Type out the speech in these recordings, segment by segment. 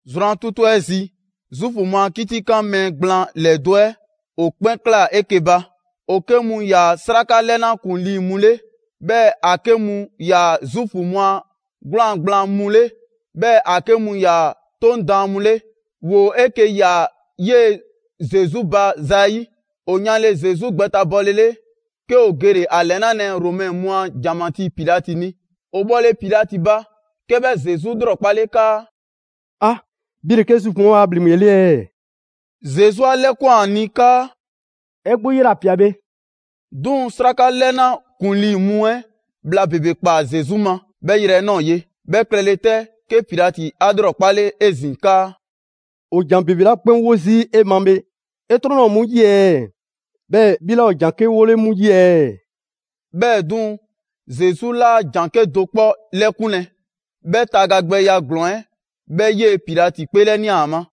Zrwan 'tutu 'ɛ zi, Zuufu mu a 'kitikan mɛɛ gblaan ‑lɛdo' 'ɛ ‑o 'kpɛn ꞊klaa 'eke‑ ba: ‑o 'ke mu ‑yaa 'sraka 'lɛna ‑kuŋlii mu 'le, 'bhɛɛ‑ ‑a 'ke mu ‑yaa' Zuufu mu a 'gwlaan‑ gblaan mu 'le, 'bhɛɛ‑ ‑a 'ke mu ‑yaa 'Toŋ daan mu 'le. ‑Woo 'eke‑ ꞊ya 'yee‑ Zesu ba zayi'. ‑O yanle Zesu gbɛtabɔlele, 'ke ‑o gele‑ ‑a ‑lɛnalɛ Romɛ mu a ‑janmatii Pilati ni. ‑O bhɔle Pilati ba, 'ke 'bhɛ Zesu 'lrɔkpale 'kaa: «'Bhi ‑le 'ke Zuufu mu 'ɛ waa ‑bhleŋgbe 'ɛ 'le ɛɛ?» Zesu 'a 'lɛkwan‑ ‑a ni 'kaa: «'E 'gbu 'yela‑ ꞊pia bhe.» 'Duŋ‑ 'sraka 'lɛna ‑kuŋlii mu 'ɛ bhla ‑bebe ꞊kpaa Zesu ma 'bhɛ yrɛ 'ɛ ꞊nɔɔ ye. 'Bhɛ klɛle 'tɛ, 'ke Pilati 'a 'lrɔkpale 'ezin‑ 'kaa: «‑Woo ‑jan ‑bebe 'la 'kpɛn 'wo zii' 'e ma bhe, 'e 'trɔn 'laa ‑o 'mu 'yi ɛɛ? 'Bhɛɛ‑ 'bhi 'laa ‑o ‑jan 'ke 'wole 'mu 'yi ɛɛ?» 'Bhɛɛ‑ 'duŋ‑, Zesu 'laa ‑jan 'kedo‑ 'kpɔ 'lɛkunlɛ. 'Bhɛ tagagbɛya ‑glɔɔn 'ɛ 'bhɛ 'yee‑ Pilati 'kpeelɛnia ‑a ma.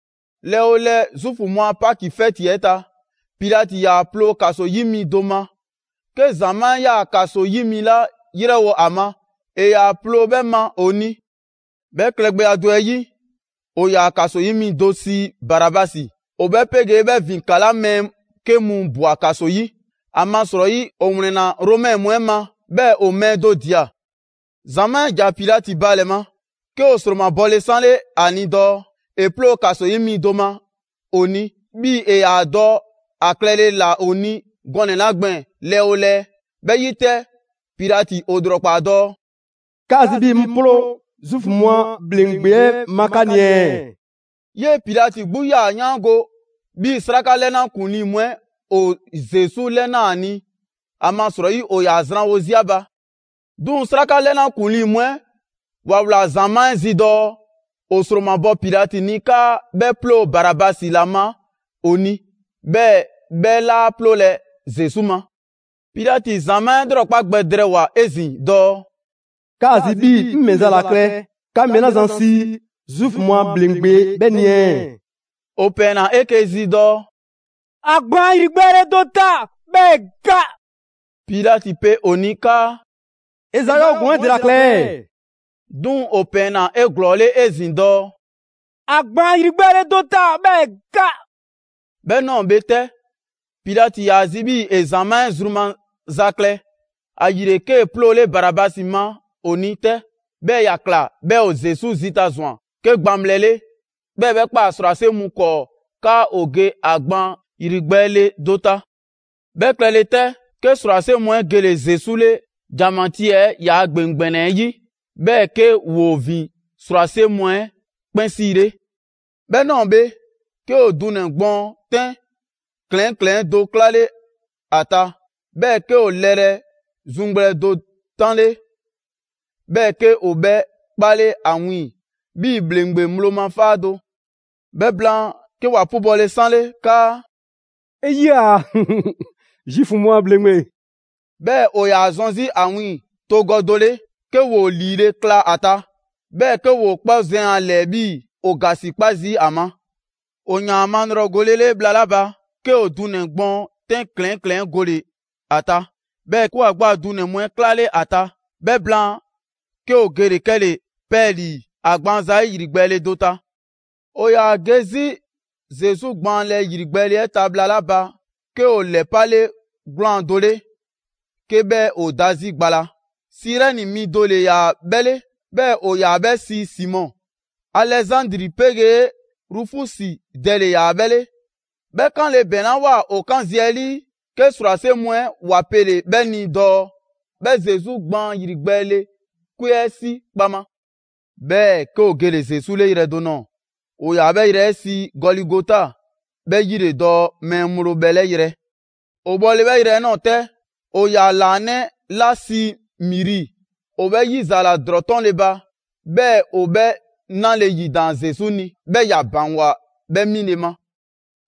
Lɛɛ 'oo lɛɛ, Zuufu mu a Paki 'fɛti 'ɛ ta, Pilati ‑yaa ploo ‑kaso 'yi mi do ma. 'Ke ‑zamaa' 'yaa‑ ‑kaso 'yi mi 'la 'yrɛwo‑ ‑a ma, ‑e ‑yaa ploo 'bhɛɛ‑ ma ‑o ni. 'Bhɛ klɛgbɛya do 'ɛ 'yi, ‑o ‑yaa ‑kaso 'yi mi do sii Barabasi. ‑O 'bhɛ 'pegee 'bhɛ ‑vin ‑kala' mɛɛ 'ke mu ꞊bwa ‑kaso 'yi, ‑amasrɔyi ‑o ‑wlɛnna Romɛ mu 'ɛ ma, 'bhɛɛ‑ ‑o mɛɛ do ꞊dia. ‑Zamaa' 'ɛ ‑ja Pilati ba ‑lɛ ma, 'ke ‑o ‑sromabɔle 'sanle ‑a ni dɔɔ ‑e 'ploo‑ ‑kaso 'yi mi do ma ‑o ni 'bhii‑ ‑e ‑yaa dɔ ‑a klɛle ‑la ‑o ni gɔnɛ‑ 'la gbɛɛn‑ lɛɛ 'oo lɛɛ. 'Bhɛ 'yi 'tɛ, Pilati ‑o ‑lrɔkpaa dɔɔ: «'Kaa‑ zi 'bhii‑ 'ŋ 'ploo‑ Zuufu mu a ‑bhleŋgbe 'ɛ ma 'ka ni ɛɛ?» 'Yee‑ Pilati 'gbu 'yaa‑ 'yaango‑ 'bhii‑ 'sraka 'lɛna ‑kuŋlii mu 'ɛ ‑o Zesu 'lɛnaa‑ ‑a ni, ‑amasrɔyi ‑o ‑yaa zranwo 'zi ‑a ba. 'Duŋ‑ 'sraka 'lɛna ‑kuŋlii mu 'ɛ ‑wa ꞊wlaa ‑zamaa' 'ɛ zi dɔɔ ‑o ‑sromabɔ Pilati ni 'kaa 'bhɛ 'ploo‑ Barabasi ‑la ma ‑o ni, 'bhɛɛ‑ 'bhɛ 'laa 'ploolɛ‑ Zesu ma. Pilati ‑zamaa' 'ɛ 'lrɔkpa gbɛ drɛɛwoa‑ 'ezin‑ dɔɔ: «'Kaa‑ zi 'bhii‑ 'ŋ ‑mɛ za ‑la klɛ 'ka mɛɛ 'la zan sii ‹Zuufu mu a ‑bhleŋgbe› 'bhɛ ni ɛɛ?» ‑O ‑pɛɛnna 'eke‑ zi dɔɔ: «‑A gbaan ‑yrigbɛɛle do ta, 'bhɛɛ‑ ‑e ga!» Pilati pe ‑o ni 'kaa: «‑E ‑za 'yɔɔ‑ ‑glɔɔn 'ɛ ‑dela ꞊kla ɛɛ?» 'Duŋ‑ ‑o ‑pɛɛnna 'eglɔɔle 'ezin‑ dɔɔ: «‑A gbaan ‑yrigbɛɛle do ta, 'bhɛɛ‑ ‑e ga!» 'Bhɛ ꞊nɔɔ bhe 'tɛ, Pilati ‑yaa zi 'bhii‑ ‑e ‑zamaa' 'ɛ zru maza klɛ, ‑ayile, 'kee‑ 'ploole Barabasi ma ‑o ni 'tɛ. 'Bhɛɛ‑ ‑ya ꞊kla 'bhɛɛ‑ ‑o Zesu zita ꞊zwan 'ke gbaŋbhlɛ 'le, 'bhɛɛ‑ ‑e 'bhɛ ꞊kpaa ‑srwase' mu 'kɔɔ 'kaa ‑o ge ‑a gbaan ‑yrigbɛɛle do ta. 'Bhɛ klɛle 'tɛ, 'ke ‑srwase' mu 'ɛ gele Zesu 'le ‑janmatii 'ɛ ‑yaa ‑gbeŋ ‑gbɛnɛ 'ɛ 'yi, 'bhɛɛ‑ 'ke ‑woo ‑vin ‑srwase' mu 'ɛ 'kpɛn 'siile. 'Bhɛ ꞊nɔɔ bhe, 'ke ‑o dunɛ‑ gbɔɔn 'tɛn ‑klɛɛn' ‑klɛɛn' do 'klale ‑a ta, 'bhɛɛ‑ 'ke ‑o lɛrɛ zuŋgbhlɛ do 'tanle, 'bhɛɛ‑ 'ke ‑o 'bhɛ 'kpale ‑a wiiŋ‑ 'bhii ‑bhleŋgbe ŋgblo ma 'faa do. 'Bhɛ blaan, 'ke ‑wa 'pubɔle 'sanle 'kaa: «'E 'yia‑, Zuufu mu a ‑bhleŋgbe!» 'Bhɛɛ‑ ‑o ‑yaa zɔn 'zi ‑a wiiŋ‑ togɔ do 'le, 'ke ‑woo ‑liile' kla a ta, 'bhɛɛ‑ 'ke ‑woo 'kpɔ zɛn ‑a ‑lɛɛ 'bhii‑ ‑o ‑gasikpa zii' ‑a ma. ‑O ‑yaan ‑a malrɔgolele bhla 'la ba, 'ke ‑o dunɛ‑ gbɔɔn 'tɛn ‑klɛɛn' ‑klɛɛn' 'ɛ gole ‑a ta, 'bhɛɛ‑ 'ke ‑wa 'gbu a dunɛ‑ mu 'ɛ 'klale ‑a ta. 'Bhɛ blaan, 'ke ‑o gele‑ 'kɛle‑ 'pɛɛlii‑ ‑a gbaan zayi' ‑yrigbɛɛle do ta. ‑O ‑yaa ge 'zi Zesu gbaanlɛ ‑yrigbɛɛle 'ɛ ta bhla 'la ba, 'ke ‑o ‑lɛpale 'gwlaan‑ do 'le 'ke 'bhɛ ‑o da 'zi gba la. Sirɛni mi do ‑le ‑yaa 'bhɛ 'le, 'bhɛɛ‑ ‑o ‑yaa 'bhɛ sii Simɔ. Alɛzandri 'pegee Rufusi dɛ ‑le ‑yaa 'bhɛ 'le. 'Bhɛ 'kanle‑ ‑bɛŋlawoa ‑o 'kan zi 'ɛ 'lii, 'ke ‑srwase' mu 'ɛ ‑wa pele‑ 'bhɛ ni dɔɔ 'bhɛ Zesu gbaan ‑yrigbɛɛle 'kwe 'ɛ 'si kpaŋma. 'Bhɛɛ‑ 'ke ‑o gele‑ Zesu 'le yrɛ do ꞊nɔɔ, ‑o ‑yaa 'bhɛ yrɛ 'ɛ sii Gɔligota, 'bhɛ 'yile‑ dɔɔ ‹mɛɛ ŋgblo bhɛlɛ' yrɛ.› ‑O bhɔle 'bhɛ yrɛ 'ɛ ꞊nɔɔ 'tɛ, ‑o ‑yaa ‑laanɛ' 'la sii miri, ‑o 'bhɛ 'yizaala ‑drɔɔ 'tɔnle‑ ba, 'bhɛɛ‑ ‑o 'bhɛ 'nale‑ ‑yidaan Zesu ni, 'bhɛɛ‑ ‑ya ‑baŋgwa 'bhɛ 'mile‑ ma.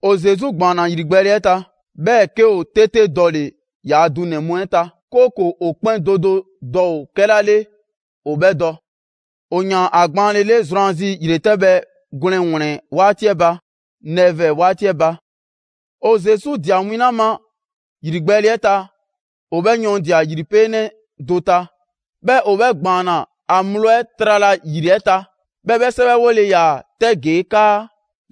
‑O Zesu ‑gbaanna ‑yrigbɛɛle 'ɛ ta. 'Bhɛɛ‑ 'ke ‑o 'tete dɔle‑ ‑yaa' dunɛ‑ mu 'ɛ ta, 'kooko‑ ‑o 'kpɛn do do dɔ ‑o 'kɛla 'le ‑o 'bhɛ dɔ. ‑O ‑yaan ‑a gbaanlele zrwanzi ‑yretɛbhɛ gwlɛn ‑wlɛn 'waati 'ɛ ba (nɛvɛɛ 'waati 'ɛ ba). ‑O Zesu ꞊dia win 'la ma ‑yrigbɛɛle 'ɛ ta, ‑o 'bhɛ yɔɔndia‑ ‑yripeenɛ do ta, 'bhɛɛ‑ ‑o 'bhɛ ‑gbaanna ‑a ŋgblo 'ɛ trala ‑yri 'ɛ ta; 'bhɛɛ‑ 'bhɛ 'sɛwɛwole ‑yaa 'tɛ ‑gee' 'kaa: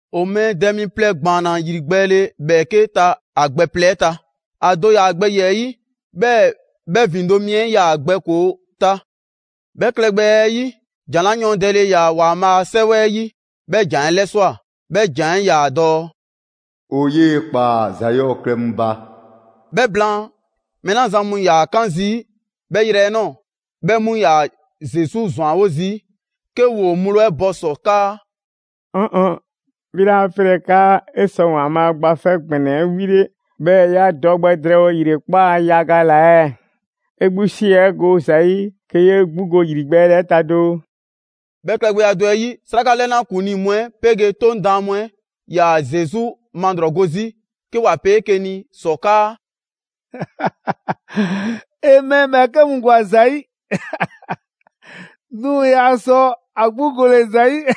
‑O mɛɛ dɛ mi plɛ ‑gbaanna ‑yrigbɛɛle ‑bhɛɛke' ta ‑a gbɛ plɛ 'ɛ ta: ‑A do ‑yaa ‑a gbɛ ‑yiɛ' 'yi, 'bhɛɛ‑ 'bhɛ ‑vindo' mi 'ɛ 'yaa‑ ‑a gbɛ ‑koo ta. ['Bhɛ klɛgbɛya 'ɛ 'yi, ‑jan 'la yɔɔndɛle ‑yaa ‑Waanbhaa' a 'Sɛwɛ 'ɛ 'yi, 'bhɛ ‑jan 'ɛ 'lɛswa꞊, 'bhɛ ‑jan 'ɛ 'yaa‑ dɔɔ: «‑O 'yee‑ ‑kpaa ‑za 'yɔɔ‑ klɛ mu ba.»] 'Bhɛ blaan, mɛɛ 'la zan mu 'yaa‑ 'kan zii' 'bhɛ yrɛ 'ɛ ꞊nɔɔ, 'bhɛ mu ‑yaa Zesu ‑zwanwo' zii' 'ke ‑woo ŋgblo 'ɛ bɔ ‑sɔ 'kaa: «‑Ɔɔn 'ɔɔn‑! 'Bhi 'laa 'pelɛ‑ 'kaa 'e sɔ ‑Waanbhaa' Gba 'Fɛ ‑Gbɛnɛ 'ɛ 'wile, 'bhɛɛ‑ 'ya dɔ gbɛ drɛɛwo ‑yrekpaa' yaga ‑la ɛɛ? 'E 'gbu 'si 'ɛ go 'ɛ ‑za 'yi, 'ke 'yee 'gbu go ‑yrigbɛɛle 'ɛ ta doo!» 'Bhɛ klɛgbɛya do 'ɛ 'yi, 'sraka 'lɛna ‑kuŋlii mu 'ɛ 'pegee 'Toŋ daan mu 'ɛ 'yaa‑ Zesu malrɔgo 'zi 'ke ‑wa pe 'eke‑ ni ‑sɔ 'kaa: «‑E mɛɛ ‑bhɛɛke' mu ‑gwa ‑za 'yi, 'duŋ‑ yaa sɔ ‑a 'gbu gole‑ ‑za yi!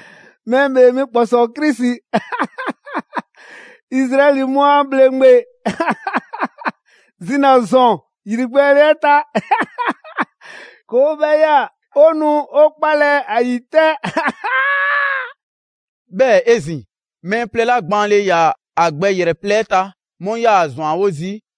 Mɛɛ ‑Bhee Mi ‑kpɔsɔɔ Krisi, Izraɛli mu a ‑bhleŋgbe, zina‑ ‑zɔn ‑yrigbɛɛle 'ɛ ta! 'Ke 'o 'bhɛ ꞊ya, 'o nu 'o 'kpalɛ‑ ‑a ‑yi 'tɛ.» 'Bhɛɛ‑ 'ezin‑, mɛɛ plɛ 'la gbaanle ‑yaa' ‑a gbɛ ‑yrɛ plɛ 'ɛ ta, 'mu 'yaa‑ ‑a ‑zwanwo' zii'.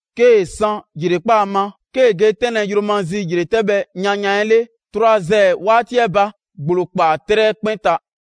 'Kee‑ san ‑yrekpaa' ma, 'kee‑ ge 'tɛnlɛ‑ yromazi ‑yretɛbhɛ yanyan 'ɛ 'le (trwazɛɛ 'waati 'ɛ ba), ‑gblo ꞊kpaa 'trɛ 'ɛ 'kpɛn ta.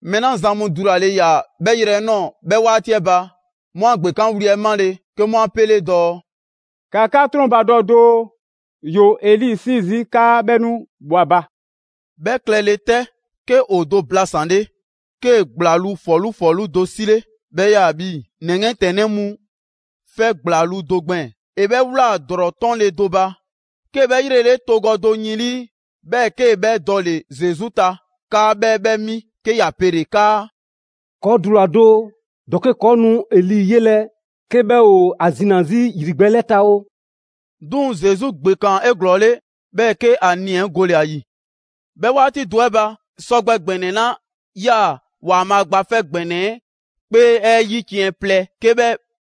Mɛɛ 'la zan mu dulale ‑yaa 'bhɛ yrɛ 'ɛ ꞊nɔɔ 'bhɛ 'waati 'ɛ ba, 'mu 'a ‑gbekanwli 'ɛ 'male‑, 'ke 'mu 'a 'pele dɔɔ: «‑Ka 'ka 'trɔnbadɔ doo, ‑yoo Eli 'sii zii' 'kaa 'bhɛ 'nu 'bhɔ 'a ba!» 'Bhɛ klɛle 'tɛ, 'ke ‑o do blasanle, 'kee‑ ‑gblaŋluu' ‑fɔlu' ‑fɔlu' do 'sile, 'bhɛ 'yaa‑ 'bhii‑ ‑nɛ 'yiɛntɛnnɛ mu 'fɛ ‑gblaŋluu' do gbɛɛn‑. ‑E 'bhɛ ꞊wlaa ‑drɔɔ 'tɔnle‑ do ba, 'kee‑ 'bhɛ 'yrele togɔ do yin 'lii, 'bhɛɛ‑ 'kee‑ 'bhɛ dɔle‑ Zesu ta 'kaa 'bhɛ 'bhɛ mi, 'ke ‑ya pele‑ 'kaa: «'Kɔɔ‑ dula‑ doo, ‑dɔke' ‑kɔɔ' nu Eli 'yelɛ‑ 'ke 'bhɛ ‑o ‑a zina‑ 'zi ‑yrigbɛɛle 'ɛ ta oo!» 'Duŋ‑ Zesu ‑gbekaan 'eglɔɔle, 'bhɛɛ‑ 'ke ‑a nii‑ 'ɛ gole‑ ‑a ‑yi. 'Bhɛ 'waati do 'ɛ ba, sɔgbɛ ‑gbɛnɛ 'la 'yaa‑ ‑Waanbhaa' Gba 'Fɛ ‑Gbɛnɛ 'kpee 'ɛ 'yiciɛn‑ plɛ, 'ke 'bhɛ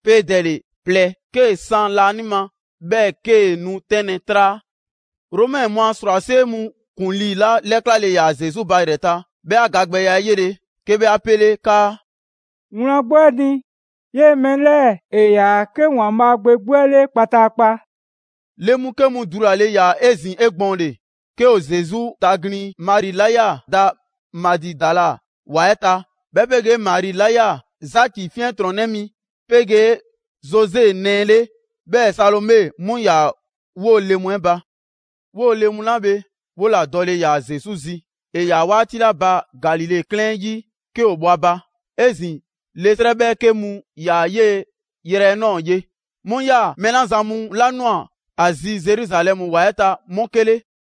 'peedɛle plɛ 'kee‑ san laanima 'bhɛɛ‑ 'kee‑ nu 'tɛnlɛ‑ 'traa. Romɛ mu a ‑srwase' mu ‑kuŋlii 'la 'lɛklale ‑yaa Zesu ba ‑yrɛ ta, 'bhɛ 'a gagbɛya 'ɛ 'yele‑, 'ke 'bhɛ 'a 'pele 'kaa: «Wlan 'gbu 'ɛ ni, 'yee‑ mɛɛ 'lɛɛ‑ 'yaa‑ 'ke ‑Waanbhaa' Gbe 'gbu 'ɛ 'le kpataakpa!» Le mu 'ke mu dulale ‑yaa 'ezin‑ 'egbɔɔnle, 'ke ‑o Zesu taglin‑. Mari 'la 'yaa‑ da Magidala ‑wa 'ɛ ta, 'bhɛ 'pegee Mari 'la 'yaa‑ Zaki 'fiɛntrɔnnɛ mi 'pegee Zose nɛɛ 'le, 'bhɛɛ‑ Salome, 'mu ‑yaa 'woo‑ le mu 'ɛ ba. 'Woo‑ le mu 'la bhe, 'wola‑ dɔle ‑yaa Zesu zi, ‑e ‑yaa 'waati 'la ba Galile 'klɛɛn 'ɛ 'yi 'ke ‑o bhɔ ‑a ba. 'Ezin‑ le 'srɛ 'bhɛɛke mu ‑yaa 'yee‑ 'yrɛ 'ɛ ꞊nɔɔ ye, 'mu 'yaa‑ mɛɛ 'la zan mu 'la ꞊nwa ‑a zi Zeruzalɛmu ‑wa 'ɛ ta, 'mu 'ke 'le.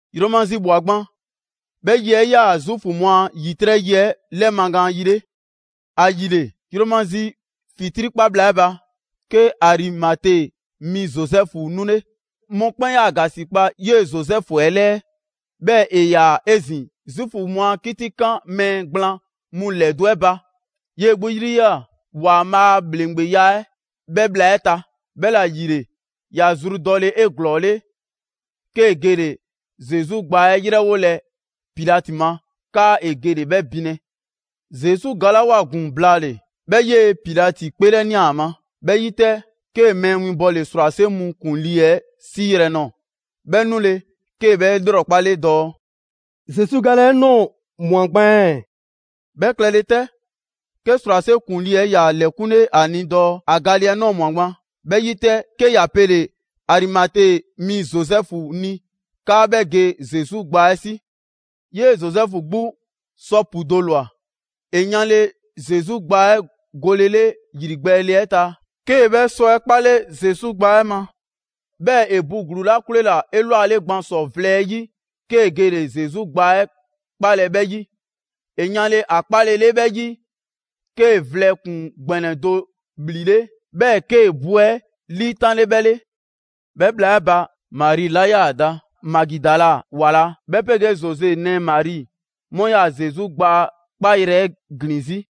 Yromazi ꞊bhwa gban. 'Bhɛ yi 'ɛ 'yaa‑ Zuufu mu a ‑yitrɛ' yi 'ɛ 'lɛmagaan yi 'le. ‑Ayile, yromazi ‑fitrii' 'kpa bhla 'ɛ ba, 'ke Arimate mi Zozɛfu 'nule. Mɔkpɛn' 'yaa‑ ‑gasikpa 'yee‑ Zozɛfu 'ɛ 'lɛɛ, 'bhɛɛ‑ ‑e ‑yaa 'ezin‑ Zuufu mu a 'kitikan mɛɛ gblaan mu ‑lɛdo' 'ɛ ba. 'Yee‑ 'gbu 'yri 'yaa‑ Waanbhaa' a ‑bhleŋgbeya 'ɛ 'bhɛ bhla 'ɛ ta. 'Bhɛla‑ ‑yile, ‑ya zru dɔle‑ 'eglɔɔle, 'kee‑ gele‑ Zesu gbaa 'ɛ 'yrɛwolɛ Pilati ma, 'kaa ‑e gele‑ 'bhɛ binlɛ. Zesu galawoa ‑gun blaale‑, 'bhɛ 'yee‑ Pilati 'kpeelɛnia ‑a ma. 'Bhɛ 'yi 'tɛ, 'kee‑ mɛɛ winbɔle ‑srwase' mu ‑kuŋlii 'ɛ 'siiyrɛ‑ ꞊nɔɔ. 'Bhɛ 'nule‑, 'kee‑ 'bhɛ ‑lrɔkpale dɔɔ: «Zesu gale 'ɛ ꞊nɔɔ ꞊mwa gban ɛɛ?» 'Bhɛ klɛle 'tɛ, 'ke ‑srwase' ‑kuŋlii 'ɛ ‑ya ‑lɛkunle 'a ni dɔɔ ‑a gale 'ɛ ꞊nɔɔ ꞊mwa gban. 'Bhɛ 'yi 'tɛ, 'ke ‑ya pele‑ Arimate mi Zozɛfu ni 'kaa 'bhɛ ge Zesu gbaa 'ɛ 'si. 'Yee‑ Zozɛfu 'gbu sɔ 'pu do ꞊lwa. ‑E yanle Zesu gbaa 'ɛ golele ‑yrigbɛɛle 'ɛ ta, 'kee‑ 'bhɛ sɔ 'ɛ 'kpale Zesu gbaa 'ɛ ma. 'Bhɛɛ‑ ‑e bu ‑gluu 'la 'kwleela‑ 'elwale gban ‑sɔ vlɛ 'ɛ 'yi, 'kee‑ gele‑ Zesu gbaa 'ɛ 'kpaalɛ‑ 'bhɛ 'yi. ‑E yanle ‑a 'kpaalele 'bhɛ 'yi, 'kee‑ vlɛ ‑kpuŋ ‑gbɛnɛ do ‑bhlile', 'bhɛɛ‑ 'kee‑ bu 'ɛ 'liitanle 'bhɛ 'le. 'Bhɛ bhla 'ɛ ba, Mari 'la 'yaa‑ da Magidala ‑wa la, 'bhɛ 'pegee Zose nɛɛ Mari, 'mu 'yaa‑ Zesu gbaa 'kpayrɛ‑ 'ɛ ‑glin 'zi.